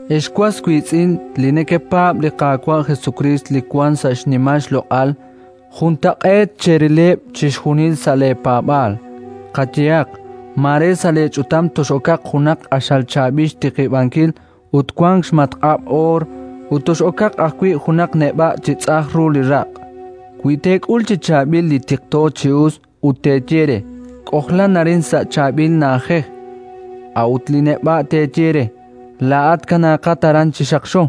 Ex was wiitz'in li nekepaab' li Qaawa' Jesukriist li wank sa' xnimal xloq'al, juntaq'eet cherileb' chixjunil sa' leepaab'aal. Qayehaq: mare sa' leech'utam tox'okaq junaq q'axal chaab'il xtiqib'ankil ut wank xmatq'ab' oor, ut tox'okaq ajwi' junaq neb'a' chi tz'ajn ru li raq'. Wi teek'ul chi chaab'il li tiqto chi us ut teeye re: “K'ojlan arin sa' chaab'il na'ajej”, a'ut li neb'a' teeye re: “Laa'at kanaaqat aran chi xaqxo”,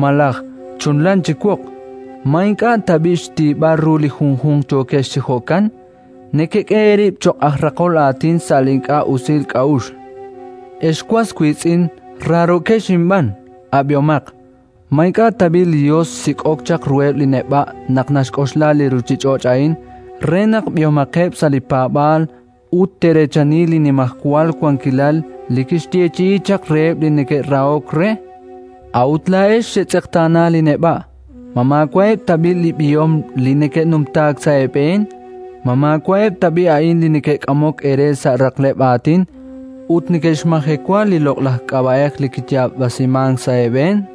malaj: “Chunlan chi woq”, ma ink'a' tab'i' xtiib'al ru li junjunq yookex chi jo'kan? Nekek'e eerib' cho'q aj raqol aatin sa' li ink'a' usil k'a'uxl. Ex was wiitz'in raarookex inb'aan, ab'ihomaq: ma ink'a' tab'i' li Yos xsik'ok chaq ruheb' li neb'a' naq naxk'oxla li ruuchich'och' a'in, re naq b'ihomaqeb' sa' li paab'aal ut te'reechani li Nimajwal Wankilal li kixyeechi'i chaq reheb' li neke'rahok re? A'ut laa'ex xetz'eqtaana li neb'a'! Ma maawa'eb' tab'i' li b'ihom li neke'numtaak sa' eeb'een? Ma maawa'eb' tab'i' a'an li neke'k'amok eere sa' raqleb' aatin ut neke'xmajewa li loq'laj k'ab'a'ej li kiyaab'asimank sa' eeb'een?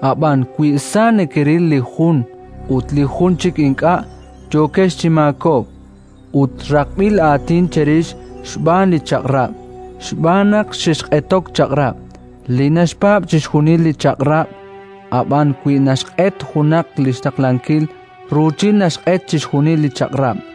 Ab'an wi sa nekeril li jun ut li jun chik ink'a', yookex chi maakob'k, ut raqb'il aatin cherix xb'aan li Chaq'rab', xb'aan naq xexq'etok chaq'rab'. Li naxpaab' chixjunil li Chaq'rab', ab'an wi naxq'et junaq li xtaqlankil, ruuchil naxq'et chixjunil li Chaq'rab'.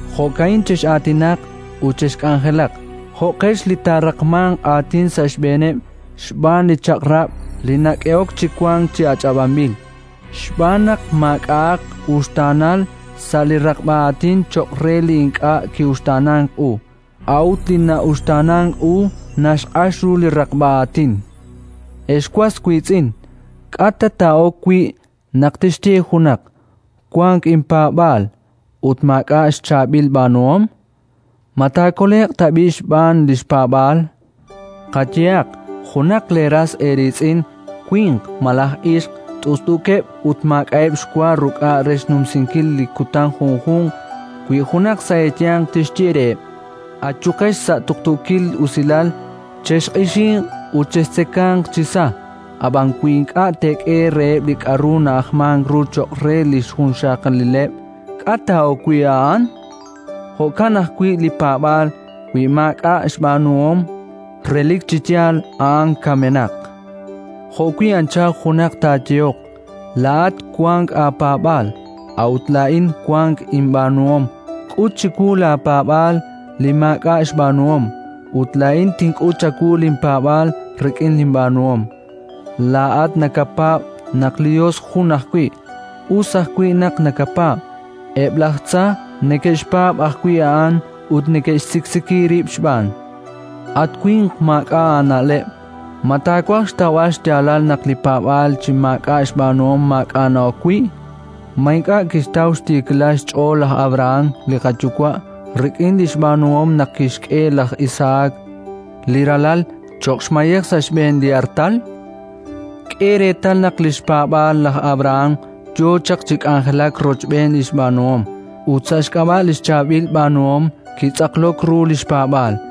Jo'ka'in chex'aatinaq ut chexk'anjelaq: jo'qex li taaraqmanq aatin sa' xb'eeneb' xb'aan li Chaq'rab' li nak'ehok chi wank chi ach'ab'anb'il. Xb'aan naq maak'a'aq uxtaanal sa' li raqb'a aatin cho'q re li ink'a' ki'uxtaanank u; a'ut li na'uxtaanank u naxq'ax ru li raqb'a aatin. Ex was wiitz'in, k'a' ta taa'ok wi' naq tixye junaq: “Wank inpaab'aal”, ut maak'a' xchaab'il b'aanuhom? Ma taakole'q tab'i' xb'aan li xpaab'aal? Qayehaq: junaq leeras eeriitz'in winq malaj ixq t'ust'uukeb' ut maak'a'eb' xwa ruk'a' re xnumsinkil li kutan junjunq, wi junaq sa' eeyanq tixye reheb': “Ayuqex sa' tuqtuukil usilal, chexq'ixinq ut chextzekanq chi sa”, ab'an wi ink'a' teek'e reheb' li k'aru na'ajmank ru cho'q re li xjunxaqalileb', k'a' taa'ok wi' a'an? Jo'kan ajwi' li paab'aal, wi maak'a' xb'aanuhom, relik chi yaal a'an kamenaq. Jo'wi' anchal junaq taayehoq: “Laa'at wank aapaab'aal, a'ut laa'in wank inb'aanuhom. K'ut chiwu laapaab'aal li maak'a' xb'aanuhom, ut laa'in tink'ut chawu linpaab'aal rik'in linb'aanuhom”. Laa'at nakapaab' naq li Yos jun ajwi': us ajwi' naq nakapaab'. Eb' laj tza neke'xpaab' ajwi' a'an ut neke'xsiksiki rib' xb'aan. At winq maak'a' aana'leb', ma taawaj xtawb'al xyaalal naq li paab'aal chi maak'a' xb'aanuhom maak'a' na'ok wi'? Ma ink'a' kixtaw xtiikilal xch'ool laj Abrahán, li qayuwa', rik'in li xb'aanuhom naq kixk'e laj Isahak, li ralal, cho'q xmayej sa' xb'een li artal? K'e reetal naq li xpaab'aal laj Abrahán yo chaq chi k'anjelak rochb'een li xb'aanuhom, ut sa' xk'ab'a' li xchaab'il b'aanuhom kitz'aqlok ru li xpaab'aal.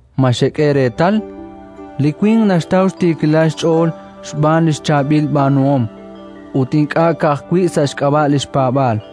Ma xek'e reetal? Li winq naxtaw xtiikilal xch'ool xb'aan li xchaab'il b'aanuhom ut ink'a' ka'ajwi' sa' xk'ab'a' li xpaab'aal.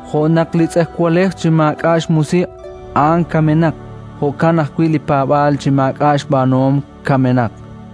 Jo' naq li tz'ejwalej chi maak'a' xmusiq', a'an kamenaq; jo'kan ajwi' li paab'aal chi maak'a' xb'aanuhom, kamenaq.